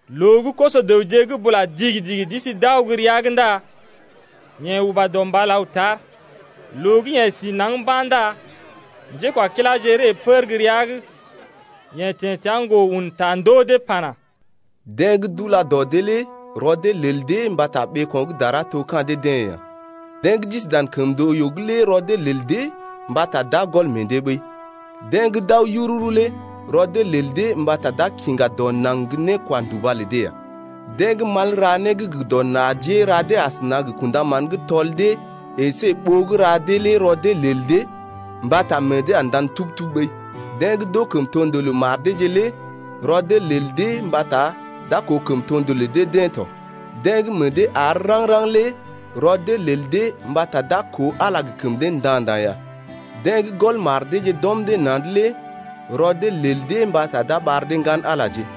Loo gə́ koso-dəwje gə́ bula digi-digi d’isi d’aw gə́ rəa’g ndá yeḛ uba dɔ mbal aw tar. Loo gə́ yeḛ si naŋg mba̰ ndá njékwakiláje ree pər gə́ rəa’g tɔ. Yeḛ teḛ təa ŋgo un ta ndoo dee ne né pana: Deḛ gə́ d’ula dɔ dee lé rɔ dee lel dee, Mbata ɓeeko̰ gə́ dara to ka̰ dee-deḛ ya. Deḛ gə́ d’isi dan kəmndooyoo’g lé rɔ dee lel dee, Mbata d’a gɔl meḛ dee ɓəi. Deḛ gə́ d’aw yururu lé rɔ dee lel dee, Mbata d’a kiŋga dɔ naŋg gə́ nékwanduba lə dee ya. Deḛ gə́ mal ra né gə́ gə dɔ najee ra dee asəna gə kṵdaman gə́ tɔl dee əsé ɓoo gə́ ra dee lé rɔ dee lel dee, Mbata meḛ dee a ndan tub-tub ɓəi. Deḛ gə́ d’oo kəmtondoo lə mar deeje lé rɔ dee lel dee, Mbata d’a koo kəmtondoo lə dee-deḛ tɔ. Deḛ gə́ meḛ dee àr raŋg-raŋg lé rɔ dee lel dee, Mbata d’a koo Ala gə kəm dee nda̰-nda̰ ya. Deḛ gə́ gɔl mar deeje d’ɔm dee na̰’d lé rɔ dee lel dee, Mbata d’a ɓar dee ŋgan-Alaje.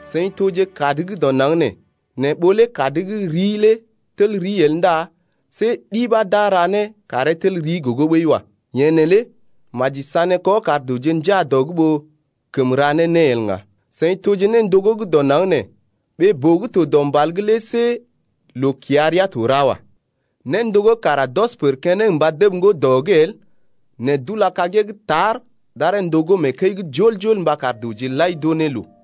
Seḭ toje kad gə́ dɔ naŋg nee. Nɛ ɓó lé kad gə́ rii lé tel rii el ndá see ɗi ɓa d’a ra ne karee tel rii gogo ɓəi wa. Yee neelé maji sané kɔ kar dəwje njaa dɔ’g ɓó kəm ra ne né el ŋga. Seḭ toje néndogó gə́ dɔ naŋg nee. Ɓee-boo gə́ to dɔ mbal’g lé see loo-kiya-rəa to ra wa. Néndogó kara d’ɔs pər keneŋ mba dəb ŋgo dɔ’g el nɛ d’ula kagee’g tar d’aree ndogó ne mee kəi’g jol-jol mba kar dəwje lai d’oo ne loo.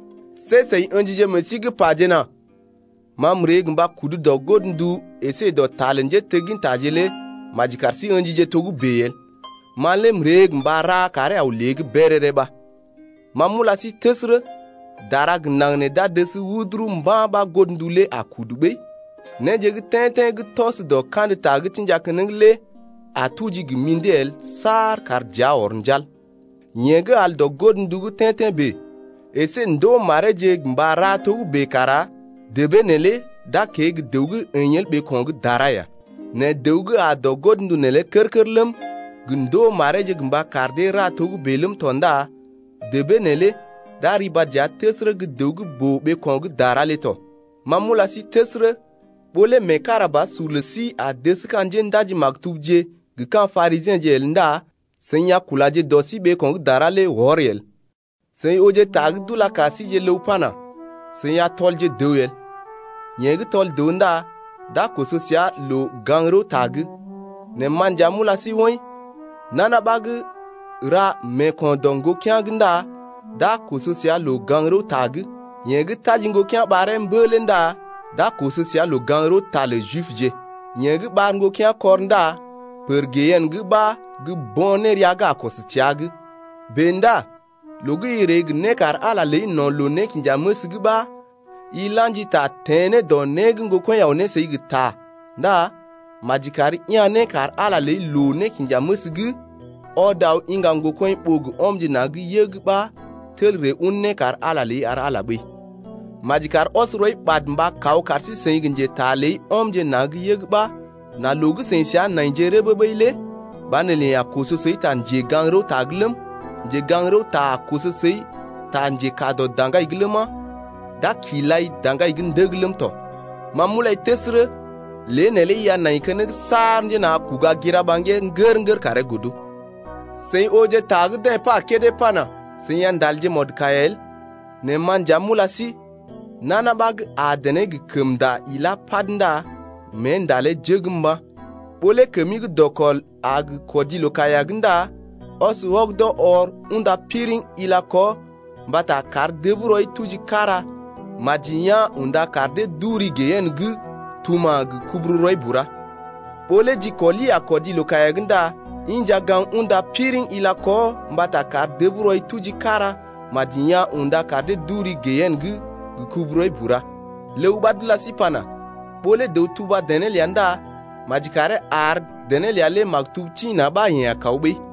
See seḭ ə̰jije meḛ sí’g pajena: Ma m’ree gə mba kudu dɔ godndu əsé gə dɔ ta lə njéteggintaje lé maji kar sí ə̰jije togə́bè el. Ma lé m’ree mba ra karee aw lée’g béréré ɓa. Ma m’ula sí təsərə, dara gə naŋg nee d’a dəs wuduru mba̰ ɓa godndu lé a kudu ɓəi, néje gə́ tḛ́-tḛ́ gə́ tɔs dɔ kandə ta gə́ tḭja keneŋ lé a tuji gə mḭdé el saar kar dəa ɔr njal. Yeḛ gə́ al dɔ godndu gə́ tḛ́-tḛ́ bèe, əsé ndoo mareeje gə mba ra togə́bè kara debee neelé d’a kée gə́ dəw gə́ əḭ el ɓeeko̰ gə́ dara ya. Nɛ dəw gə́ aa dɔ godndu neelé kər-kər ləm, gə ndoo mareeje gə mba kar dee ra togə́bè ləm tɔ ndá debee neelé d’a riba dəa təsərə gə́ dəw gə́ boo ɓeeko̰ gə́ dara lé tɔ. Ma m’ula sí təsərə, ɓó lé meekarabasur lə sí a kunda ka̰ njéndaji-maktubje gə ka̰ Parisiḛje el ndá seḭ a kulaje dɔ sí ɓeeko̰ gə́ dara lé wɔr el. Seḭ ooje ta gə́ d’ula ka síje gə́ ləw pana: I a tɔl dəw el. Yeḛ gə́ tɔl dəw ndá d’a koso səa loo-gaŋg-rəwta’g. Nɛ ma nja m’ula sí woḭ, nana ɓa gə́ ra meeko̰ dɔ ŋgokea̰’g ndá d’a koso səa loo-gaŋg-rəwta’g ya. Yeḛ gə́ taji ŋgokea̰ ɓaree mbə lé ndá d’a koso səa loo-gaŋg-rəwta lə Jibje. Yeḛ gə́ ɓar ŋgokea̰ kɔr ndá pər gehene’g ɓa gə́ bo̰ nérea gə́ a kɔs təa’g. Bèe ndá loo gə́ i ree gə nékar-Ala ləi no̰ loo-nékinjaməs’g ɓa i la̰ji ta teḛ ne dɔ né gə́ ŋgokɔḭ aw ne səi gə ta ndá maji kari ya̰ nékar-Ala ləi no̰ loo-nékinjaməs’g ɔd aw iŋga ŋgokɔḭ ɓó gə ɔmje səa na̰’d yəg ɓa tel ree un nékar-Ala ləi lé ar Ala ɓəi. Maji kari ɔs rɔi ɓad mba kaw kar sí-seḭ gə njeta ləi ɔmje na̰’d yəg ɓa nà loo gə́ seḭ səa naije rəbə ɓəi lé banelə yeḛ a koso səi ta njegaŋ-rəwta’g ləm, njegaŋ-rəwta a koso səi ta njekaa dɔ daŋgai’g ləma, d’a kilai daŋgai’g ndəd ləm tɔ. Ma m’ulai təsərə, lée neelé i a nai keneŋ saar njena a kuga gira ɓaŋgee ŋgər-ŋgər karee godo. Seḭ ooje ta gə́ deḛ pa kédé pana: I a ndal mɔdkaiya el. Nɛ ma nja m’ula sí, nana ɓa gə́ aa dené gə kəmnda ilá pad ndá mée ndalee jəgm mba̰. Ɓó lé kəmi gə́ dɔkɔl a gə kɔdi loo-kaiya’g ndá ɔs wɔgədɔ ɔr unda piriŋ ilá kɔ mbata kar dəb rɔi tuji kára, maji yaa̰ unda kar dee d’uri gehene’g tuma̰ gə kubururɔi bura. Ɓó lé jikɔli a kɔdi loo-kaiya’g ndá inja gaŋg unda piriŋ ila kɔ mbata kar dəb rɔi tuji kára, maji yaa̰ unda kar dee d’uri gehene gə kubururɔi bura. Ləw ɓa d’ula sí pana: Ɓó lé dəw tuba dené ləa ndá maji karee ar dené ləa lé maktub tḭ-na̰ ɓa yeḛ a kaw ɓəi.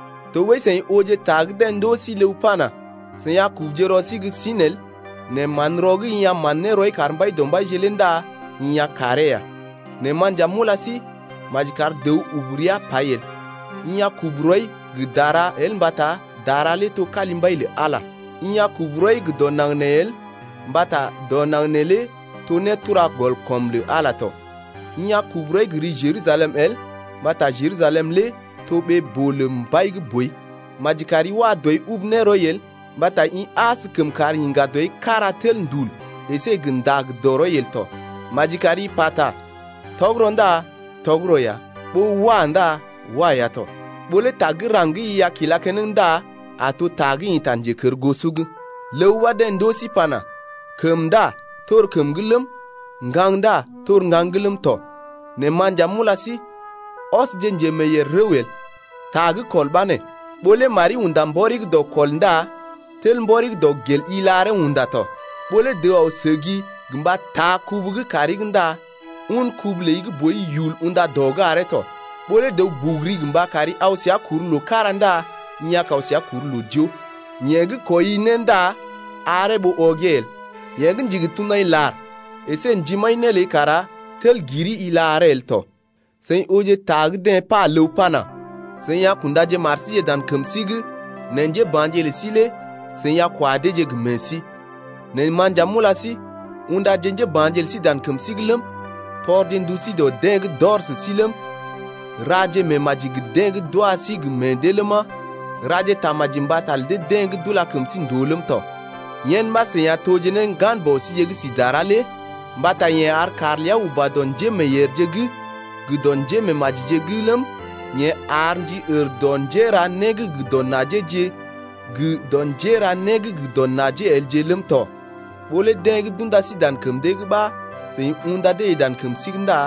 Tɔɓəi seḭ ooje ta gə́ deḛ ndoo sí ləw pana: Seḭ a kubuje rɔ sí gə sḭ el nɛ manrɔ gə́ i a man ne rɔi kar Mbaidɔmbaije lé ndá i a karee ya. Nɛ ma nja m’ula sí, maji kar dəw ubu rəa pai el. I a kubu rɔi gə dara el mbata dara lé to kalimbai lə Ala ya. I a kubu rɔi gə dɔ naŋg nee el mbata dɔ naŋg neelé to nétura-gɔl-kɔm lə Ala tɔ. I a kubu rɔi gə ri Jerusalem el, mbata Jerusalem lé to ɓee-boo lə mbai gə́ boi. Maji kari wa dɔi ubu ne rɔi el mbata i askəm kar yiŋga dɔi kára tel ndul əsé gə ndá gə dɔrɔi el tɔ. Maji kar i pata: Tɔgərɔ ndá tɔgərɔ ya, ɓó wah! ndá wah! ya tɔ. Ɓó lé ta gə́ raŋg gə́ i a kila keneŋ ndá a to ta gə́ ḭ ta njekərgoso’g. Ləw ɓa deḛ ndoo sí pana: Kəm ndá tor kəm’g ləm, ŋgaŋ ndá tor ŋgaŋ ləm tɔ. Nɛ ma nja m’ula sí, ɔsje njemeeyèr rəw el. Ta gə́ kɔl ɓa nee: Ɓó lé mari unda mbɔri gə́ dɔkɔl ndá tel mbɔri gə́ dɔgel ila aree unda tɔ. Ɓó lé dəw aw səgi mba taa kubu gə́ kaari’g ndá un kubu ləi gə́ boi yul unda dɔ’g aree tɔ. Ɓó lé dəw buguri gə mba kari aw səa kuruloo kára ndá i a kaw səa kuruloo joo. Yeḛ gə́ kwɔii né ndá aree ɓó ɔgee el. Yeḛ gə́ ndigi tonai lar əsé ndimai né ləi kara tel giri ila aree el tɔ. Seḭ ooje ta gə́ deḛ pa ləw pana: Seḭ a kundaje marije dan kəm sí’g nɛ njéba̰je lə sí lé seḭ a kwa deeje gə meḛ sí. Nɛ ma nja m’ula sí, undaje njéba̰je lə sí dan kəm sí’g ləm, tɔrje ndu sí dɔ deḛ gə́ d’ɔr sə sí ləm, raje meemaji gə deḛ gə́ d’wa sí gə meḛ dee ləma, raje tamaji mbata lə deḛ gə́ d’ula kəm sí ndòo ləm tɔ. Yen ɓa seḭ a toje ne ŋgan Bɔ síje gə́ si dara lé, mbata yeḛ ar kàr ləa uba dɔ njémeeyèrje’g gə dɔ njémeemajije’g ləm, yeḛ ar ndi ər dɔ njéra né gə́ gə dɔ najee-je gə dɔ njéra né gə́ gə dɔ najee-elje ləm tɔ. Ɓó lé deḛ gə́ d’unda sí dan kəm dee’g ɓa seḭ unda deeje dan kəm sí’g ndá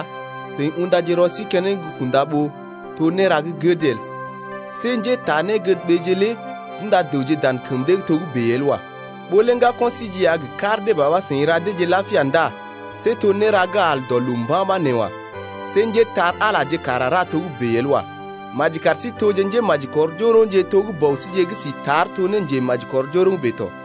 seḭ undaje rɔ sí keneŋ gə́ kunda ɓó to néra gə́ gəd el. See njétaa négədɓeje lé d’unda dəwje dan kəm dee’g togə́bè el wa. Ɓó lé ŋgako̰ síje ya gə kar dee ba ɓa seḭ ra deeje lapia ndá see to néra gə́ al dɔ loo mba̰ ɓa nee wa. See njépole-magəje kara ra togə́bè el wa. Maji kar sí toje njémaji kɔrnjoroŋje to gə́ Bɔ síje gə́ si tar to ne njemaji kɔrnjoroŋ bèe tɔ.